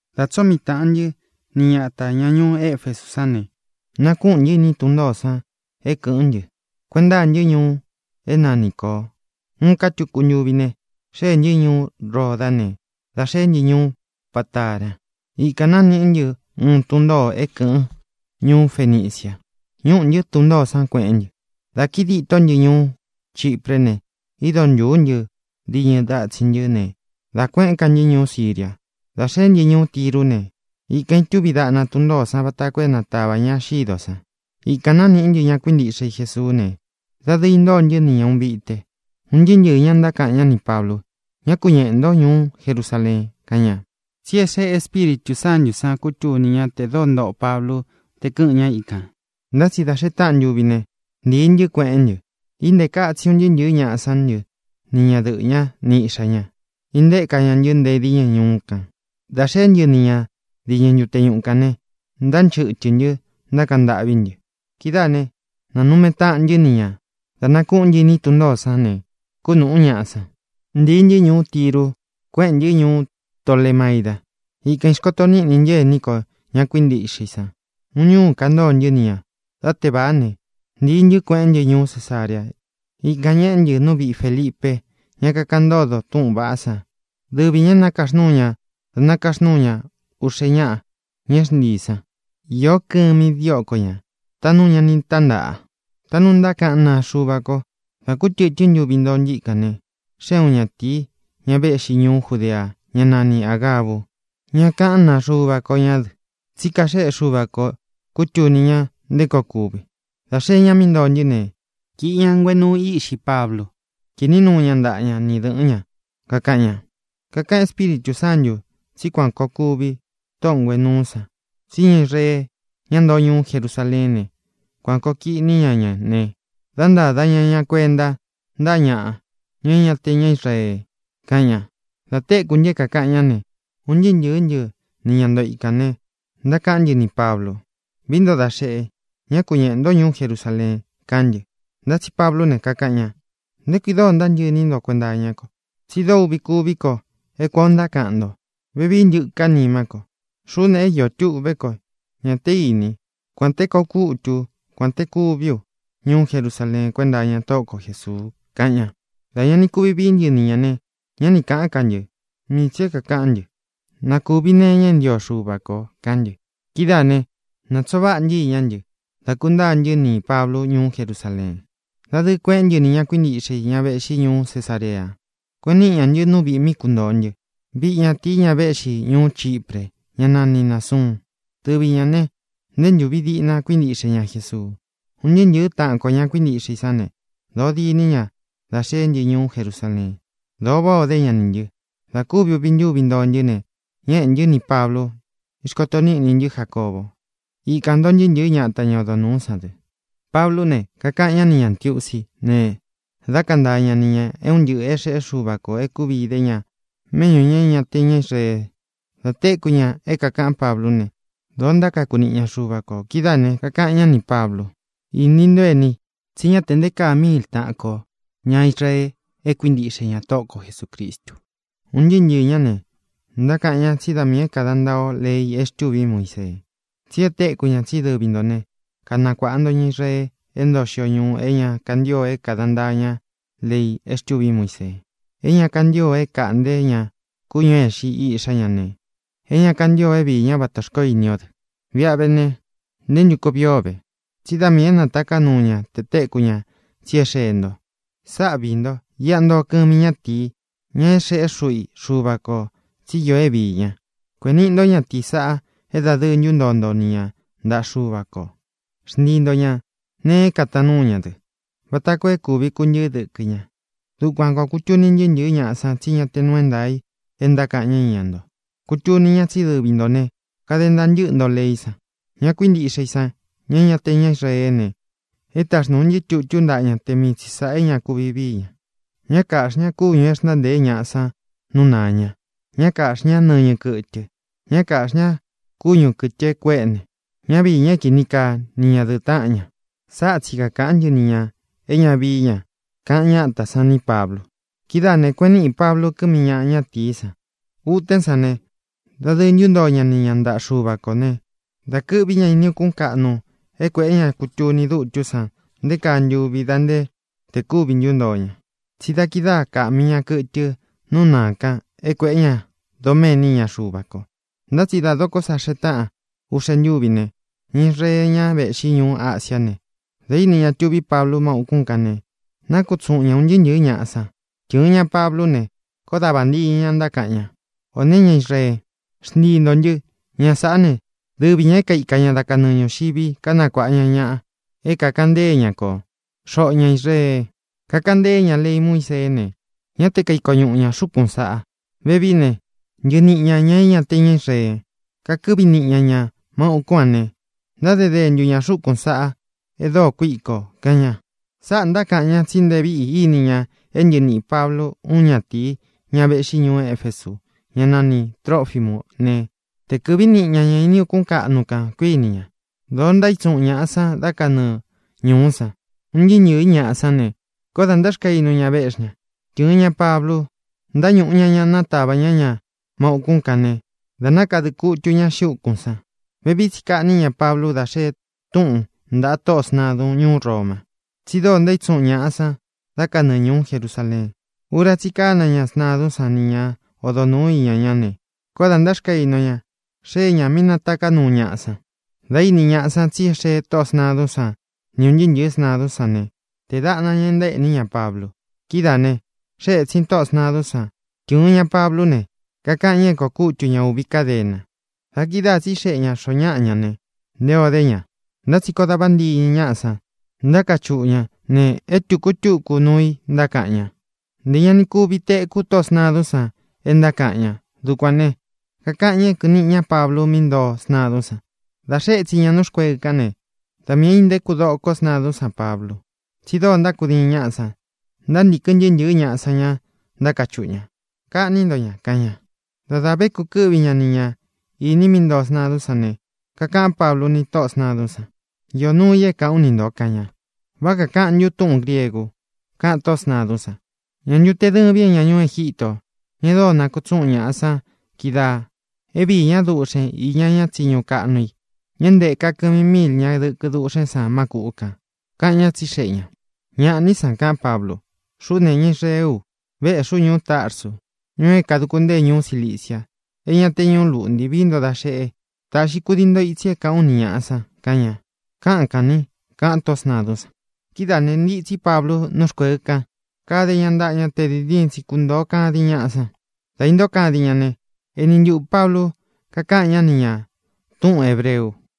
Dā tsóo mii tāꞌan ntɨ́ ni ñatā, ña ñuú Efesú san ne, nakúꞌūn ntɨ́ iní tun ntōó san é kɨ̄ꞌɨ́n ntɨ. Kueꞌen ntáa ntɨ́ ñuu é nanī Koo. Uun ká tuku ntuvi xeé ntɨ ñuú Ródā ne, da xeé ntɨ ñuú Patara. Ikān nániꞌí ntɨ uun tun ntōo é kɨ̄ꞌɨn ñuú Fenicia. Ñúꞌū ntɨ́ tun ntōó san, kueꞌén ntɨ. Dā kíi ditó ntɨ ñuú Chipré ne, ido ntūú ntɨ diñɨ datsin ntɨ́ ne, dá kuēꞌén ka ntɨ́ ñuú Siria. Dā xeé ntɨ ñuú Tirú ne, ikān itúvi daꞌna tun ntōó san vata koo é natavā ña xídō san. Ikān nániꞌí ntɨ ña kuíntiꞌxe i Jesuú ne, dadɨɨ intóo ntɨ́ ni ña ūun vite. Un ntɨɨ́ ntɨɨ̄ ñá ntákaꞌan ñá nī Pablu: —Ñá ku ñeꞌē ntó ñuú Jerusaleen —kaꞌan ña. Tsi é xeꞌe Espíritū Sántū san kútuni ña te dóo ntoꞌo Pablu te kɨ́ꞌɨ̄n ñá ikān. Ntá tsi da xee táꞌan ntuvi ne, ntīi ntɨ́, kueꞌén ntɨ. Íntēka itsi un ntɨɨ́ ntɨ̄ɨ́ ñaꞌa sán ntɨ ni ñadɨꞌɨ̄ ñá ni iꞌxā ñá, íntēka ña ntɨ́ nte díñɨ ñuú kān. Dā xeé ntɨ ni ña diñɨ ntute ñuꞌu kān ne, ntánchɨtɨ̄ ntɨ́, ntákaꞌan ntâꞌví ntɨ. Kidáā né, nānume taꞌan ntɨ́ ni ñā. Dā nákuꞌún ntɨ iní tun ntōó san ne, kúnūꞌú ñaꞌa san. Ntīi ntɨ́ ñuú Tiru, kuéꞌen ntɨ́ ñuú Tolemaida. Ikān ixkoto níꞌni ntɨ ení kō, ña kuíntiꞌxe i san. Uun ñúū kantóō ntɨ́ ni ñā. Dá tevāá ne, ntīi ntɨ́, kueꞌén ntɨ ñuú Cesarea. Ikān ñeꞌé ntɨ nú viꞌi Fēlipe, ña kakaꞌan ntódo túꞌūn vaꞌá san. Dɨvi ñā é nakaxnúu ña da nakaxnúu ña uꞌxe ñáꞌa, ña é xntiī san. Īó kɨmi dióko ñā, taꞌnú ña ni tántaꞌa, taꞌnu ntákaꞌan náa Xuva ko. Dā kú tɨtɨ́n ntuvi ntoo ntɨ́ ikān ne, xée uun ñatīi, ña véꞌxi ñuú Judea, ñá nani Āgabu. Ña kaꞌán naa Xuva ko ñá dɨ, tsí kaxéꞌe Xuva ko kūtuni ña nté koo kuvi. Dā xee ñá mí ntoo ntɨ́ ne, kīꞌi ña nguenuu íꞌxi Pablu, kiꞌní nuu ña ntaꞌa ña ni dɨ̄ꞌɨ́n ña, kakaꞌan ña: —Kakaꞌán Espíritū Sántū tsí kuān koo kuvi tóꞌō nguenuu sáꞌa, tsí ña Israee, ñá ntoo ñuú Jerusaleén ne, kuān koo kiꞌní ña ña ne, dá ntāda ña ña kuenta ntáꞌa ñaꞌa, ña é ña te ña Israee —kaꞌan ña. Dā téku ntɨ é kākaꞌan ñá ne, un ntɨɨ́ ntɨ̄ɨ́ ntɨ ni ña ntoo ikān ne, ntákaꞌán ntɨ nī Pablu: —Vií nto da xeꞌe, ñá ku ñeꞌē ntó ñuú Jerusaleen —kaꞌán ntɨ. Ntá tsi Pablú ne, kakaꞌan ña: —¿Nté kui dóo ntántɨꞌɨ iní nto kuenta iñá ko? Tsí dóo uꞌvi kúvi ko é kuān ó ntákaꞌan nto. Vevií ntɨká nimá ko. Xuꞌú ne, é iō tuꞌvé ko. Ñā té ini, kuān té koo kútu u, kuān té kuví u ñuú Jerusaleen kuénta iña Tóꞌo ko Jēsuu —kaꞌan ña. Dā ña ni kuvi vií ntɨ ni ñā ne, ñá ni kāꞌán ka ntɨ. Mii tsī é kākaꞌán ntɨ: —Nā kuvi nee iña é ntio Xuva ko —kaꞌán ntɨ. Kidáā ne, natsoo váꞌa ntɨ́ iñá ntɨ, dá kūntáa ntɨ́ nī Pablu ñuú Jerusaleen. Dadɨɨ kueꞌén ntɨ nī ña kuíntiꞌxe i, ña véꞌxi ñuú Cesarea. Kueꞌen níꞌi ñā ntɨ́ nú viꞌī mí kuntōo ntɨ́, viꞌi ñatīi, ña véꞌxi ñuú Chipre, ñá nani Nāsuun. Dɨvi ñā ne, nté ntūvi diꞌna kuíntiꞌxe ña Jesuu. Un ntɨɨ́ ntɨ̄ɨ́ taꞌan ko, ña kuíntiꞌxe i sán ne, dōo diní ña dá xeé ntɨ ñuú Jerusaleen. Dōo váꞌā o dé ña nī ntɨ. Dā kúvi uvi ntúvi ntoo ntɨ́ ne, ñéꞌē ntɨ́ nī Pablu, ixkoto níꞌni ntɨ́ Jacóbo. Ikān ntoo ntɨɨ́ ntɨ̄ɨ́ ñata, ña odo nūú san dɨ. Pablú ne, kakaꞌan ñá ni ñā ntiusi ne, dá kantaa ña ni ñā é un ntɨꞌɨ̄ é xeꞌé Xuva kō e kúvi idé ña méꞌñū ña é ña te ña Israee. Dā téku ña é kākaꞌán Pablú ne, dōo ntákaku niꞌi ña Xuva kō. Kidáā ne, kakaꞌan ñá nī Pablu: —Ini ntó, eni, tsí ña te nté kaa miil taꞌan ko ña Israee é kuíntiꞌxe ña Tóꞌo ko Jesūcristu. Un ntɨɨ́ ntɨɨ̄ ñá ne, ntákaꞌan ñá tsi da miī é kāda ntaa o lei é xtûví Muisee. Tsí e téku ña tsí dɨvi ntō né, kanakuāꞌa nto ña Israee é ntoo xio ñuu é ña kantío é kāda ntaa ña lei é xtûví Muisee, é ña kantío é kāꞌnté ña kúñū é ixi iꞌxá ña ne, é ña kantío é viī ñá vata xkoó ini o dɨ. Viꞌa ve ne, ¿nté ntu koo vii o ve? Tsí da miī é nataká nuu ña tē kútuni ñá tsi é xeé nto. Sáꞌa viī nto: Iꞌá ntoo kɨmi ñátīi, ña é xeꞌé xuꞌu i Xuva kō tsí iō é viī ña. Kuēꞌen níꞌi nto ñátīí saꞌa é dadɨɨ ntuntoo nto ni ña ntaꞌa Xuva kō. Xntii nto ña nēe kataan núu ña dɨ, vata koo é kūvi kuntɨɨ́ dɨkɨ ña. Dukuān koo kutuni ntɨɨ́ ntɨ̄ɨ́ ñaꞌa san tsí ñá tē nuu é ntaā i é ntákaꞌan ñá iña nto. Kutuni ñá tsí dɨvi ntō ne, kade ntaa ntɨ́ꞌɨ nto leí san. Ña kuíntiꞌxe i san, ña é ña te ña Israeé ne, e táxnūu ntɨ́ tutú ntaꞌa ña te mii tsi sāꞌá é ña kuvi vií ña: ñá kāꞌxi ñá kúñū é xntáa ntēé ñaꞌa san nú nāa ña; ñá kāꞌxi ñá nɨñɨ kɨ́tɨ; ñá kāꞌxi ñá kúñu kɨ̄tɨ é kuéꞌne; ñá viī ña é kini kaa ni ñadɨ̄ꞌɨ táꞌan ña. Sáꞌa tsi kakāꞌán ntɨ ni ñā é ña vii ña —kaꞌan ñátā san ní Pablu. Kidáā ne, kueꞌen níꞌi Pablu kɨmi ñáꞌa, ñatīí san. Utén san ne, dadɨɨ ntúntoo ña ni ña ntāꞌa Xúva kō ne, da kɨ́ꞌvi ña ini ukún kaꞌnu é kuēꞌé ña kutuni dutú san nté kaa ntuvi da nte te kuvi ntúntoo ña, tsí da kidáa kāꞌmi ña kɨtɨ nú nāa kan é kuēꞌé ña doméni iña Xuva ko. Ntá tsi dá dokó sa xee táꞌan uꞌxe ntúvi ne, ña Israee, ña véꞌxi ñuu Ásiā né, dā íni ña tuví Pablu má ūkún kān ne, nákutsuꞌun ña ūn ntɨɨ́ ntɨ̄ɨ́ ñaꞌa san. Tɨ̄ɨn ña Pablú ne, koó da vāntiñɨ ña, ntákaꞌan ña: —¡Ō né, ña Israee, xntii ntō ntɨ! Ña sāꞌá ne, dɨvi ñā é kaika ña dá kanɨɨ ñūxivi, kanakuáꞌa ña ñaꞌa é kāꞌan ntée ña ko, xoꞌo ña Israee. Kakaꞌan ntée ña lei Muíseé ne, ñá te kaiko ñuꞌu ña xūkún saꞌa. Vevií ne, ntɨɨ niꞌi ñā ña é ña te ña Israee, kakɨ́ꞌvi niꞌi ña ña má ūkún a ne, ntáde dentu ña xūkún saꞌa e dóo kuíko —kaꞌan ña. Sáꞌā ntákaꞌan ña, tsí nté vīꞌi íni ña é ntɨɨ niꞌī Pablu úun ñatīi, ña véꞌxi ñuú Efesu, ñá nani Trōfimú ne, te kɨ̄ꞌví niꞌi ña ña ini ukún kaꞌnu kān, kuiní ña. Dōo ntaítsuꞌun ñaꞌa san da kanɨ́ɨ ñūú san. Un ntɨɨ́ ntɨ̄ɨ́ ñaꞌa san ne, koó dā ntáxkainu ña, véꞌxi ña. Tɨ̄ɨn ña Pablu, ntáñūꞌu ña ña, nátavā ñá ña má ūkún kan ne, dā nákadɨ kutu ña xiꞌi úkūn san. Vevií tsi kaꞌní ña Pablu dá xee túꞌun ntāꞌa tóꞌō sntadun ñuú Roma tsí dóo ntaítsuꞌun ñaꞌa san da kanɨɨ ñūú Jerusaleen. Ura tsí i kána ña sntadún san ni ña odo nūú iña ñá ne, koó dā ntáxkainu ña, xee ña mi nátaká nuu ñaꞌa san. Dā íni ñaꞌa san tsí e xee tóꞌō sntadún san ni ūn ntɨɨ́ ntɨ̄ɨ́ sntadún san ne, tēé daꞌna ña e ntaéꞌní ña Pablu. Kidáā ne, xée ētsin tóꞌō sntadún san, tɨ́ɨn ña Pablú ne, kakaꞌan ña é kōo kútu ña ūvi kádena. Da kidáā tsíxeꞌe ña xōo ñáꞌa ña ne, nté ō dé ña. Ntá tsi koó da vāntiñɨ ñáꞌa san, ntákachuꞌu ña ne, é tūku e túku nuu i ntákaꞌan ña. Ntē ña ni kuvi teku tóꞌō sntadún san é ntákaꞌan ña. Dukuān ne, kakaꞌan ña é kɨ̄ꞌɨn niꞌi ñá Pablu mí ntoo sntadún sān. Dā xée ētsin ña nú rkueɨ kán ne, da miī é intéku doko sntadún san Pablu, tsí dóo ntákudiin ñáꞌa san. Ntántīkɨn ntɨɨ́ ntɨ̄ɨ́ ñaꞌa san ña, ntákachuꞌu ña: —¡Kaꞌní nto ña! —kaꞌan ña. Dá dā vé kukɨ́ꞌvi ña ni ñā iní i mí ntoo sntadún san ne, kakaꞌán Pablu ni tóꞌō sntadún san: —Iō nuu i é kāꞌán u ni ntō —kaꞌan ña. —¿Vá kakāꞌan ntún túꞌūn griegu? —kaꞌan tóꞌō sntadún san—. ¿Ñā ntu te dɨ́vīn é ña ñuú Egítō, ña e dóo nakutsúꞌun ñaꞌa sán kidáā é viī ñá duꞌxen iña ña tsiñu kaꞌnu i, ña é nteka kɨmi míil ña dɨkɨ dúꞌxen san má kūꞌu kan? —kaꞌan ñá, tsixeꞌe ñā. —¡Ñāꞌá ni san! —kaꞌán Pablu—. Xuꞌú ne, ña Israeé u. Vēꞌxí u ñuú Tarsu, ñuu é kāduku ntée ñuú Cilicia, é ña te ñuú luꞌnti. Vií nto da xeꞌe, taꞌxi kudii nto itsi é kāꞌán u ni ñāꞌa san —kaꞌan ña. —Káꞌan kān ní —kaꞌan tóꞌō sntadún san. Kidáā ne, ntitsí Pablu nú rkueɨ kan, kade ña ntáꞌa ña tē diin diin tsi kuntōo kadin ñaꞌa san. Dā intóo kadin ña ne, eni ntuꞌū Pablu kakáꞌan ñá ni ñā túꞌūn hebreu: